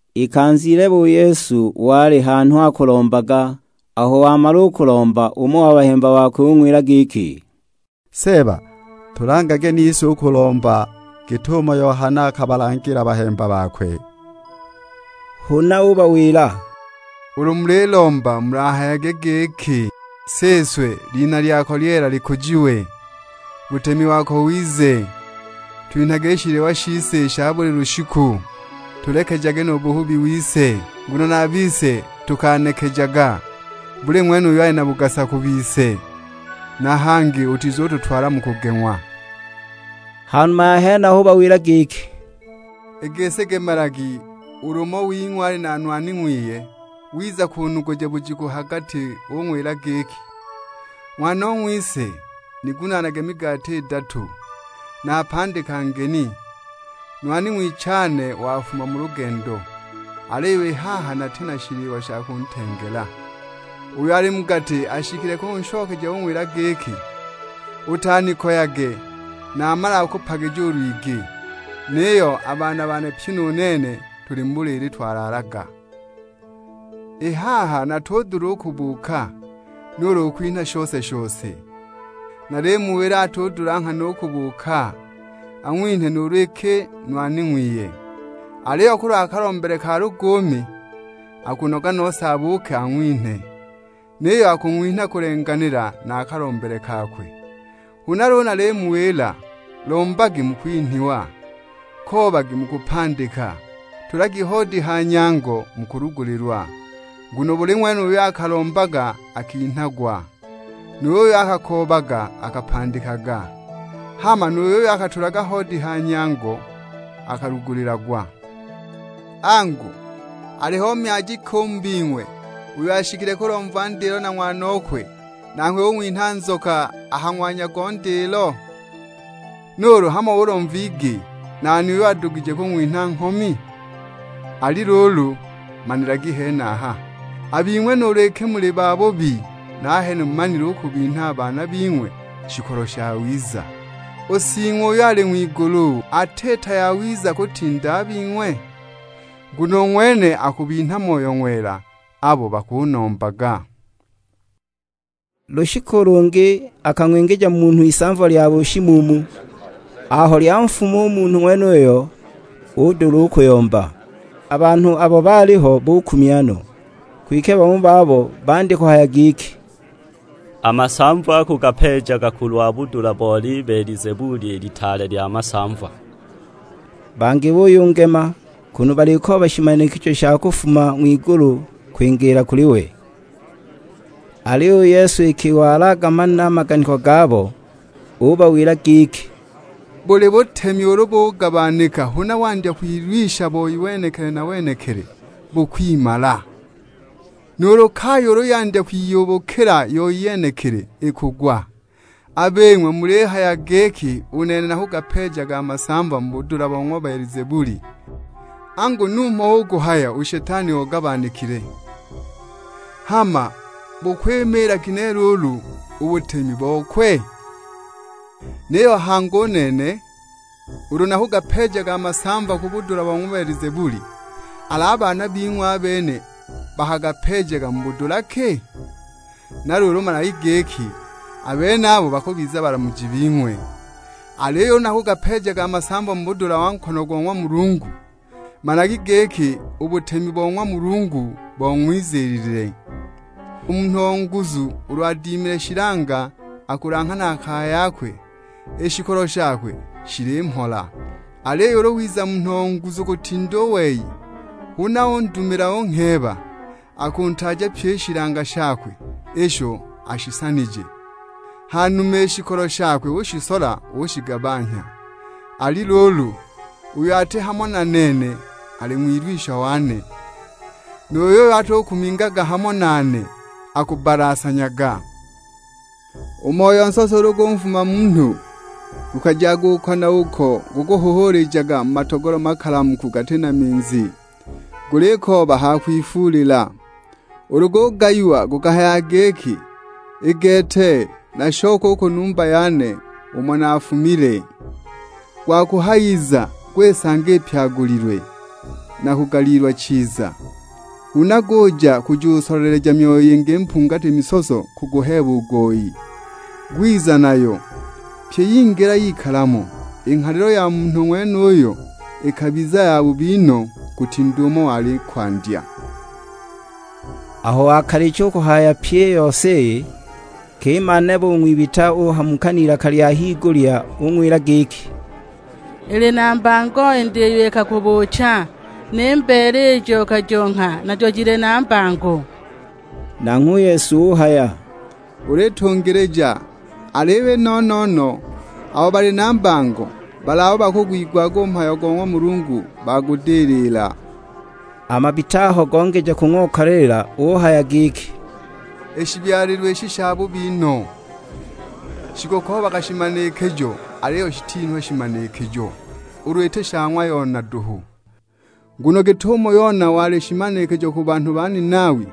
Ikanza ilebe u Yesu wali hanhu akulombaga, aho wamala u kulomba umo o bahemba bakwe ung'wila giki, "Seeba, tulangage nise u kulomba git'umo Yohana akabalangila bahemba bakwe." Huna ubawila, "Ulu mulilomba mulahayage giki, 'Siswe, lina lyako lyeela likujiwe, butemi wako wize. Twinhage i shiliwa shise i sha buli lushiku. Tulekejage nu buhubi wise, nguno na a bise tukanekejaga buli ng'wene uyo ali na bugasa ku bise. Na hangi utizututwala mu kugeng'wa.' " Ha numa ya henaho ubawila giki, "I gisi gemelagi ulu umo wing'we ali na nwani ng'wiye wiza kunuguja bujiku ha gati ung'wila giki, 'Ng'wanong'wise, nigunaanage migati idatu. Napandika ngeni, nwani ng'wichane wafuma mu lugendo; aliyo i haha nati na shiliwa sha kuntengela!' Uyo ali mu gati ashikile kunshokeja ung'wila giki, 'Utanikoyage, namalaga kupagija u lwigi; niyo a baana bane pyi nu nene tuli mu buliili twalaalaga; i haha natudula u kubuuka, nuulu kukwinha shose-shose!' Nalimuwila atudula nghana u kubuuka ang'winhe nuulu iki nwani ng'wiye. Aliyo kulwa kalombele ka luguumi, akunoga nose abuuke ang'winhe; niyo akung'winha kulenganila na a kalombele kakwe. Huna luulu nalimuwila lombagi mukwinhwa, koobagi mukupandika, tulagi hoodi ha nyango mukulugulilwa. Nguno buli ng'wene uyo akalombaga akinhagwa, nu yuyo akakoobaga akapandikaga, hama nu yuyo akatulaga hoodi ha nyango akalugulilagwa. Angu, aliho myaji ki u mu bing'we uyo ashikile kulomva ndilo na ng'wanokwe, nanghwe ung'winha nzoka a ha ng'wanya go ndilo? Nuulu hamo ulomva igi, nani uyo adugije kung'winha nghomi? Ali luulu, manilagi henaho; a bing'we nuulu iki muli babubi, nahene mumanile u kubinha a baana bing'we shikolo shawiza. U Sing'we uyo ali ng'wigulu, atiita yawiza kutinda a bing'we? Nguno u ng'wene akubinha Moyo Ng'wela abo bakunombaga." Lushiku lungi akang'wingija munhu isamva lya bushimuumu; aho lyanfuma u munhu ng'wenuyo udula u kuyomba. A banhu abo baaliho bukumya no. Kwike bamo babo bandya kuhaya giki, "A masamva akugapeejaga kulwa budula bo Libelizebuli, i litaale lya masamva." Bangi buyungema, kunu balikooba shimanikijo sha kufuma ng'wigulu kwingiila kuli we. Aliyo u Yesu iki wali agamanile a maganiko gabo, ubawila giki; "Buli butemi ulu bugabanika huna wandya kwilwisha boi wenekili na wenekili, bukwimala. Nuulu kaya ulu yandya kwiyubukila yoi yenekili ikugwa. A bing'we mulihaya giki u nene nakugapeejaga a masamva mu budula bo ng'wa Belizebuli, angu numho hu kuhaya u Shetani ogabanikile. Hama bukwimiila ginehe luulu u butemi bokwe? Niyo hangi, u nene ulu nakugapeejaga a masamva mu budula bo ng'wa Belizebuli, al'a baana bing'we, a bene bakagapeejaga mu budula ki? Na luulu managi giki, a benabo bakubiza balamuji bing'we! Aliyo ulu nakugapeejaga a masamva mu budula bo nkono go ng'wa Mulungu, managi giki u butemi bo ng'wa Mulungu bong'wiziilile! U munhu o nguzu ulu adimile shilanga akulanghanaga kaya yakwe, i shikolo shakwe shili mhola. Aliyo ulu wiza munhu o nguzu kutinda u wei, huna undumila ungheeba, akuntaaja pyi i shilanga shakwe isho ashisanije, hanuma i shikolo shakwe ushisola ushigabanhya. Ali luulu, uyo ati hamo na nene ali ng'wilwisha wane, nu yuyo atukumingaga hamo nane akubbalasanyaga!" "U moyo nsoso ulu gunfuma munhu, gukajaga uko na uko gukuhuhuulijaga mu matogolo makalamuku gati na minzi, gulikooba ha kwifuulila. Ulu gugayiwa gukahayaga giki, 'I gete nashoke u ku numba yane umo naafumile!' Gwakuhayiza, gwisanga ipyagulilwe, na kugaliilwa chiza. Huna guja kujusoleleja myoyo yingi mpungati misoso kuguheeba u goyi, gwiza nayo; pyi yingila yikala mo. I nghalilo ya ng'wa munhu ng'wenuyo ikabizaga yabubi no, kutinda umo wali i kwandya!" Aho wakalicha u kuhaya pyi i yose iyi, nkima nebe u ng'wibita uhamuka n'ilaka lya higulya ung'wila giki "Ili na mbango i nda iyo ikakubuucha, ni mbeele ijo ukajongha najo jili na mbango!" Nanghwe u Yesu uhaya, "Ulitungilija, aliyo i no-no-no abo bali na mbango, bali abo bakugwigwaga u mhayo go ng'wa Mulungu bagudilila." A mabita aho gongeja kung'okaliila, uhaya giki, "I shibyalilwe ishi shabubi no; shikukoobaga shimanikijo, aliyo shitinhwa shimanikijo, ulu iti sha ng'wa Yona duhu! Nguno git'umo Yona wali shimanikijo ku banhu ba Ninawi,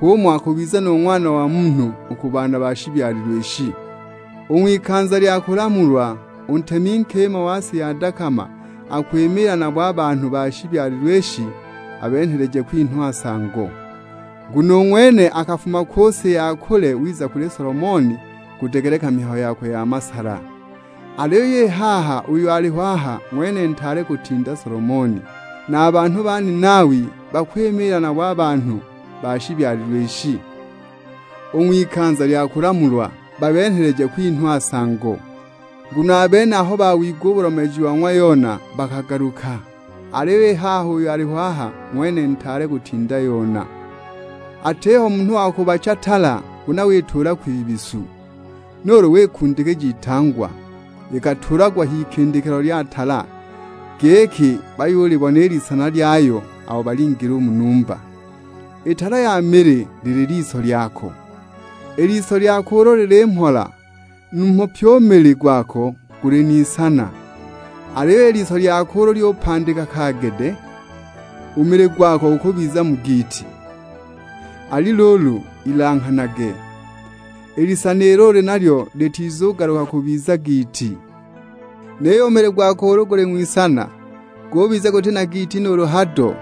h'umo akubizila nu Ng'wana wa Munhu u ku banhu ba shibyalilwe ishi. U ng'wikanza lya kulamulwa, u ntemi nkima wa si ya dakama akwimiila nabo a banhu ba shibyalilwe ishi abenheleje kwinhwa nsango. Nguno u ng'wene akafuma ku si ya kule wiza kuli Solomoni kudegeleka mihayo yakwe ya masala, aliyo i haha uyo aliho aha ng'wene ntaale kutinda Solomoni. Na a banhu ba Ninawi bakwimiila nabo a banhu ba shibyalilwe ishi, u ng'wikanza lya kulamulwa, babenheleje kwinhwa nsango. Nguno a bene aho bawigwa u bulomeeji bo ng'wa Yona bakagaluka; aliyo i haha uyo aliho aha ng'wene ntaale kutinda Yona." "Atiho munhu wa kubacha tala huna wakituula kwibisu, nuulu wikundikija itangwa. Ikatuulagwa h'ikindikilo lya tala, giki bayulibona i lisana lyayo abo balingila u mu numba. I tala ya mili lili liso lyako; i liso lyako ulu lili mhola, numho pyi u mili gwako guli n'isana. Aliyo i liso lyako ulu lyupandika kaagede, u mili gwako gukubiza mu giiti. Ali luulu, ilanghanage, i lisana ilo uli nalyo litizugaluka kubiza giiti. Niyo u mili gwako ulu guli ng'wisana, gubiza guti na giiti nuulu hado,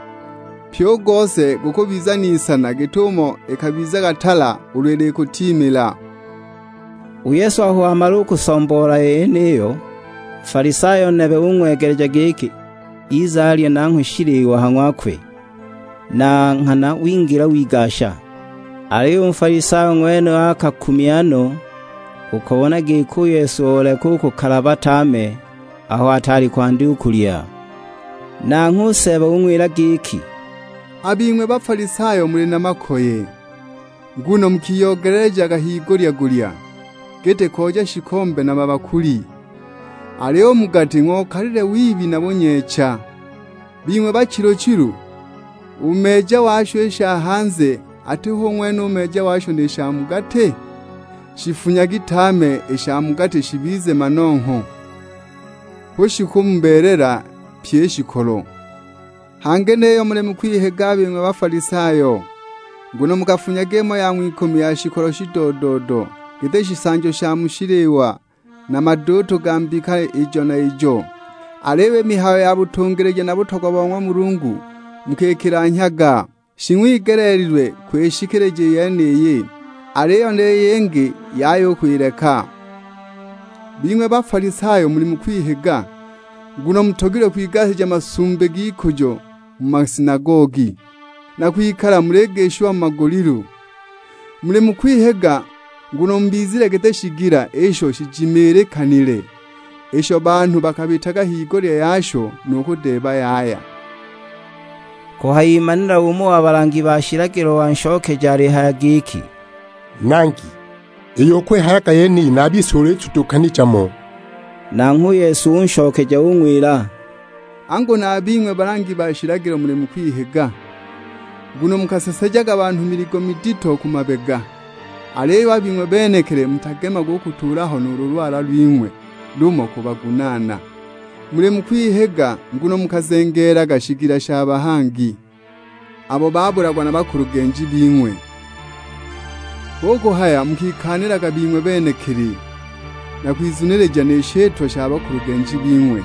pyi u gose gukubiza n'isana git'umo ikabizilaga tala ulu ilikutiimila." U Yesu aho wamala u kusomboola i yeniyo, Nfalisayo nebe ung'wegeleja giki ize alye nanghwe shiliwa ha ng'wakwe; na nghana wingila wigasha. Aliyo u Nfalisayo ng'wenuyo akakumya no u kubona giki u Yesu oleka u kukalaba tame aho ataali kwandya u kulya. Nanghwe u Seeba ung'wila giki, "A bing'we Bafalisayo muli na makoye, nguno mukiyoogelelejaga higulya-gulya, giti kooja shikombe na mabakuli, aliyo u mu gati ng'okalile wibi na bunyeecha. Bing'we bachilu-chilu, u meeja washo i sha hanze ati hu ng'wene u meeja washo ni sha mu gati? Shifunyagi tame i sha mu gati shibize manongho, hu shikumubeelela pyi i shikolo. Hangi niyo muli mu kwihiga a bing'we Bafalisayo, nguno mukafunyaga imo ya ng'wikumi ya shikolo shido-do-do, giti shisanjo sha mu shiliwa na maduutu ga mbika ijo na ijo! Aliyo i mihayo ya butungilija na butogwa bo ng'wa Mulungu mukikilanhyaga! Shing'wigeleelilwe kwishikilija i yeniyi, aliyo ni yingi yaya u kwileka. Bing'we Bafalisayo muli mu kwihiga, nguno mutogilwe kwigasija masumbi g'ikujo mu masinagogi, na kwikala muligishiwa mu magulilu. Muli mu kwihiga, nguno mubizile giti shigila isho shijimilikanile, isho banhu bakabitaga higulya yasho nu kudeeba yaya!" Kuhayimanila umo wa balangi ba shilagilo wanshokeja alihaya giki, "Nangi, iyo ukwihayaga yeniyo na a bise ulitudukanija mo!" Nanghwe u Yesu unshokeja ung'wila, "Angu na a bing'we balangi ba shilagilo muli mu kwihiga, nguno mukasesejaga banhu miligo midito ku mabega, aliyo a bing'we benekili mutagemaga u kutuula ho nuulu lwala lwing'we lumo kubagunaana. Muli mu kwihiga, nguno mukazengeelaga shigila sha bahangi; abo babulagwa na bakulugenji bing'we. Hu kuhaya mukikaanilaga bing'we benekili, na kwizunilija ni shitwa sha bakulugenji bing'we,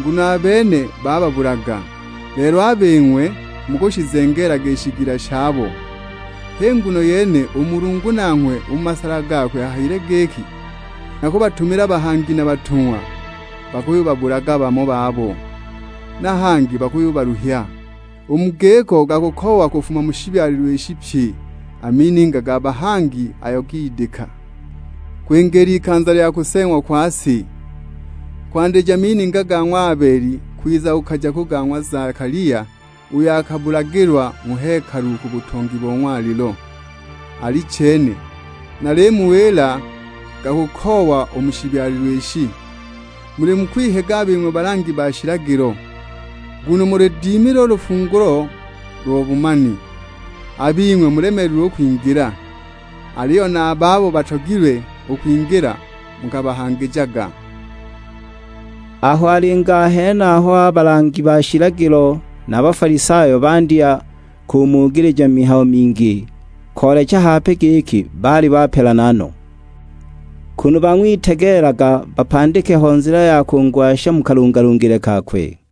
nguno a bene bababulaga, lelo a bing'we mukushizengeelaga i shigila shabo! H'i nguno yene u Mulungu nanghwe u mu masala gakwe ahayile giki, 'Nakubatumila bahangi na batung'wa; bakuyubabulaga bamo babo, na bangi bakubaluhya. U mu giko gakukoowa kufuma mu shibyalilwe ishi pye a mininga ga bahangi ayo gidika; kwingiila ikanza lya kuseeng'wa kwa si. Kwandija mininga ga ng'wa Abeli kwiza kukaja ku ga ng'wa Zakalia uyo akabulagilwa mu hekalu ku butongi bo ng'walilo. Alichene, nalimuwila gakukoowa u mu shibyalilwe ishi.' Muli mu kwihiga a bing'we balangi ba shilagilo, nguno muludimile u lufungulo lwa bumani. A bing'we mulemeelilwe u kwingila, aliyo na a babo batogilwe u kwingila mukabahangijaga!" Aho alinga a henaho a balangi ba shilagilo na a Bafalisayo bandya kumugilija mihayo mingi, koolecha hape giki baali bapelana no; kunu bang'witegeelaga bapandikile ho nzila ya kungwasha mu kalungalungile kakwe.